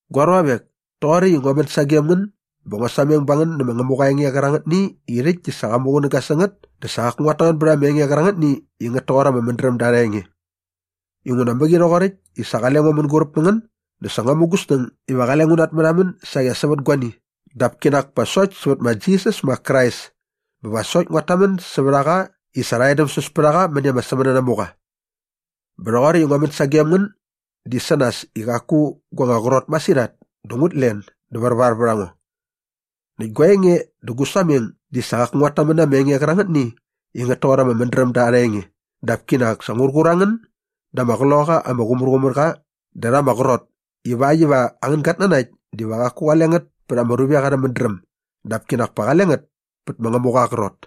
Gua ruavek, toqoräkt i ngua män sagem ngän bä ngua sameng ba ngän nä ma Ngämuqa aa enge qärangätni i rhäkt di sa qa muqunäga sä ngät dä sa qaku nguat tamän bät ama enge qärangätni i ngät toqor ama mädrämda arha enge. Inguna mäqi rhoqoräkt i sa qale ngo mänguräp mä ngän dä sa ngua mu gu snäng iva qale ngu natmärhamän saqi as sävät guani dap kinak pa sokt sävät ma Jisas ma Krais bä va sokt nguat tamän sävät a qa i sa rha edämsäs pät a qa mäni ama sämänanamuqa. Bä rhoqoräkt i ngua män sagem ngän di sä nas i qaku gua anga qrot masirhat dä ngut len dä värvar vät a ngo. Näkt gua enge dä gu sameng di sa qaku nguat tamän na ama enge qärangätni i ngät toqor ama mädrämda arha enge dap kinak sa ngur qur a ngän da ama Qloqaqa ama Qumärqumärqa dä rha ama qrot ivakt iva angän gatnanakt diva qaku qale ngät pät ama ruvek arhä mädräm dap kinak pa qale ngät pät ma Ngämuqa aa qrot.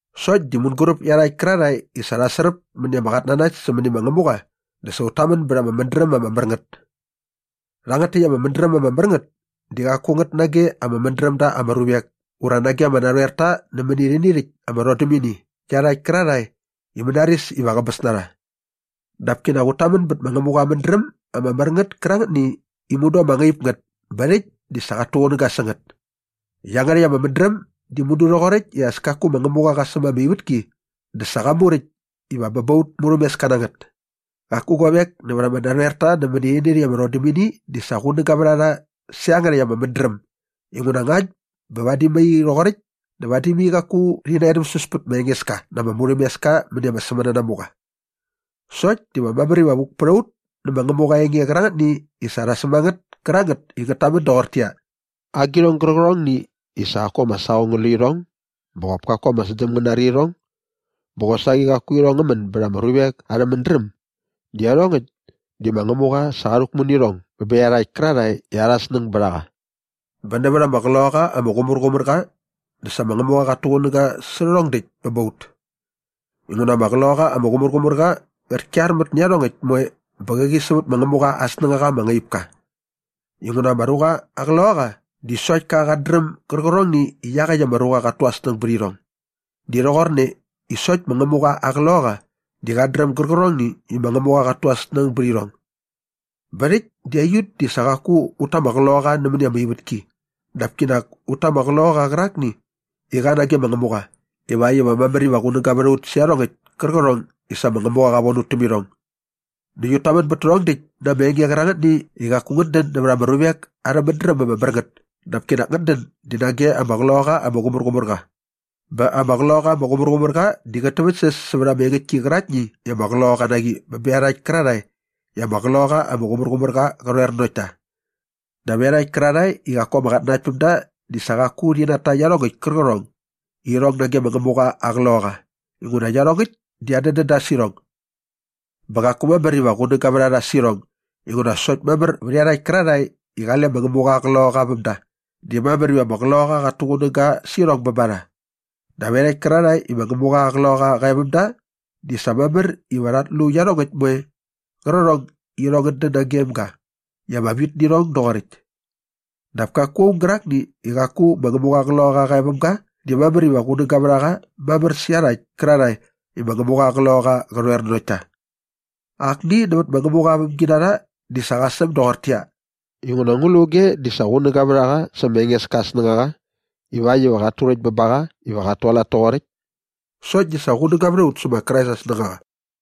Sokt di mänguräp iarhakt kärarhae i sa rha sräp mäni ama qatnanakt sämäni ma Ngämuqa dä sa ut tamän bät ama mädräm ama mär ngät. Rhangät täkt ama mädräm ama mär ngät di qaku ngät nage ama mädräm da ama ruvek ura nage ama narhoerta nämäni rhäni rhäkt ama rhodämini iarhakt kärarhae i mänaris iva qäbäs na rha. Dap kinak ut tamän bät ma Ngämuqa aa mädräm ama mär ngät kärangätni i mudu ama ngaip ngät bä rhäkt di sa qat tuqunäga sä ngät. Iangärhäkt ama mädräm di mudu rhoqoräkt i as kaku ma Ngämuqa qa säm ama ivätki dä sa qa muräkt iva bä ba aut murhämeska na ngät. Qaku guavek nävät ama narhoerta nämäni rhäni rhäkt ama rhodämini di sa qunäga vät a rha sä iangärhäkt ama mädräm inguna ngakt bä vadi mai rhoqoräkt dä vadi mai qaku rhi naedämsäs pät ma Engeska na ama murhämeska mäni ama sämänanamuqa. Sokt diva mamär iva vuk pät a ut nä ma Ngämuqa aa enge qärangätni i sa rha säm a ngät kärangät i ngät tamän doqortäqyia, “Agirhong gärqärhongni i sa qaku ama saqong ngä lu irhong bä qop kaku ama sdäm ngä nari irhong bä qosaqi qaku irhong ngä män bät ama ruvek arhä mädräm di iarhongäkt di ma Ngämuqa sa qa rhäkmu nä irhong bä bä iarhakt kärarhae i arha snäng bät a qa.” Bä nävät ama Qloqaqa ama Qumärqumärqa dä sa ma Ngämuqa qat tuqunäga sä rhärhong däkt bä ba ut. Inguna ama Qloqaqa ama Qumärqumärqa qät kyarmät nä iarhongäkt moe bä qäqi sävät ma Ngämuqa aa snängaqa ama ngaip ka. Inguna ama ruqa aa qloqaqa di sokt ka qat dräm gärqärhongni i iaqäkt ka ruqa qat tu aa snäng bät irhong. Di rhoqorne i sokt ma Ngämuqa aa Qloqaqa di qat dräm gärqärhongni i ma Ngämuqa qat tu aa snäng bät irhong. Bä rhäkt di aiut di sa qaku ut ta ama qloqaqa nämäni ama ivätki dap kinak ut ta ama Qloqaqa qärakni i qa nage ma Ngämuqa ivakt iva mamär iva qunäga vät a ut sä iarhongäkt kärqärhong i sa ma Ngämuqa qa von ut täm irhong. Näkt ut tamän bät tärhong däkt na ama enge qärangätni i qaku ngät dän nävät ama ruvek arhä mädräm ama mär ngät dap kinak ngät dän di nage ama Qloqaqa ama Qumärqumärqa. Bä ama Qloqaqa ama Qumärqumärqa di qät täväktsäs sävät ama engäktki käraktni i ama qloqaqa na qi bä bä iarhakt kärarhae i ama Qloqaqa ama Qumärqumärqa qä rhoer nanokt ta. Dap iarhakt kärarhae i qaku ama qatnanaktpämda di sa qaku rhi nata iarhongäkt kärqärhong i irhong nage ma Ngämuqa aa Qloqaqa inguna iarhongäkt di adädän da sä irhong. Bä qaku mamär iva qunäga vät a rha sä irhong inguna sokt mamär vät iarhakt kärarhae i qale ma Ngämuqa aa Qloqaqa väm da di mamär iva ama Qloqaqa qät tuqunäga sä irhong bä ba rha. Dap iarhakt kärarhae i ma Ngämuqa aa Qloqaqa qa e väm da di sa mamär iva rhat lu iarhongäkt moe qärqärhong i irhong ngät dän nagem ga i ama vit nä irhong doqoräkt. Dap kaku aung gärakni i qaku ma Ngämuqa aa Qloqaqa qa e väm ga di mamär iva qunäga vät a qa mamär sä iarhakt kärarhae i ma Ngämuqa aa Qloqaqa qä rhoer nanokt ta. Akni nävät ma Ngämuqa aa vämginarha di sa qa säm doqortäqyia, “Inguna ngu lu auge di sa qunäga vät a qa sä ma Engeska aa snängaqa ivakt iva qat turäkt bä ba qa iva qat tualat toqoräkt?” Sokt di sa qunäga vät a ut sä ma Krais aa snängaqa.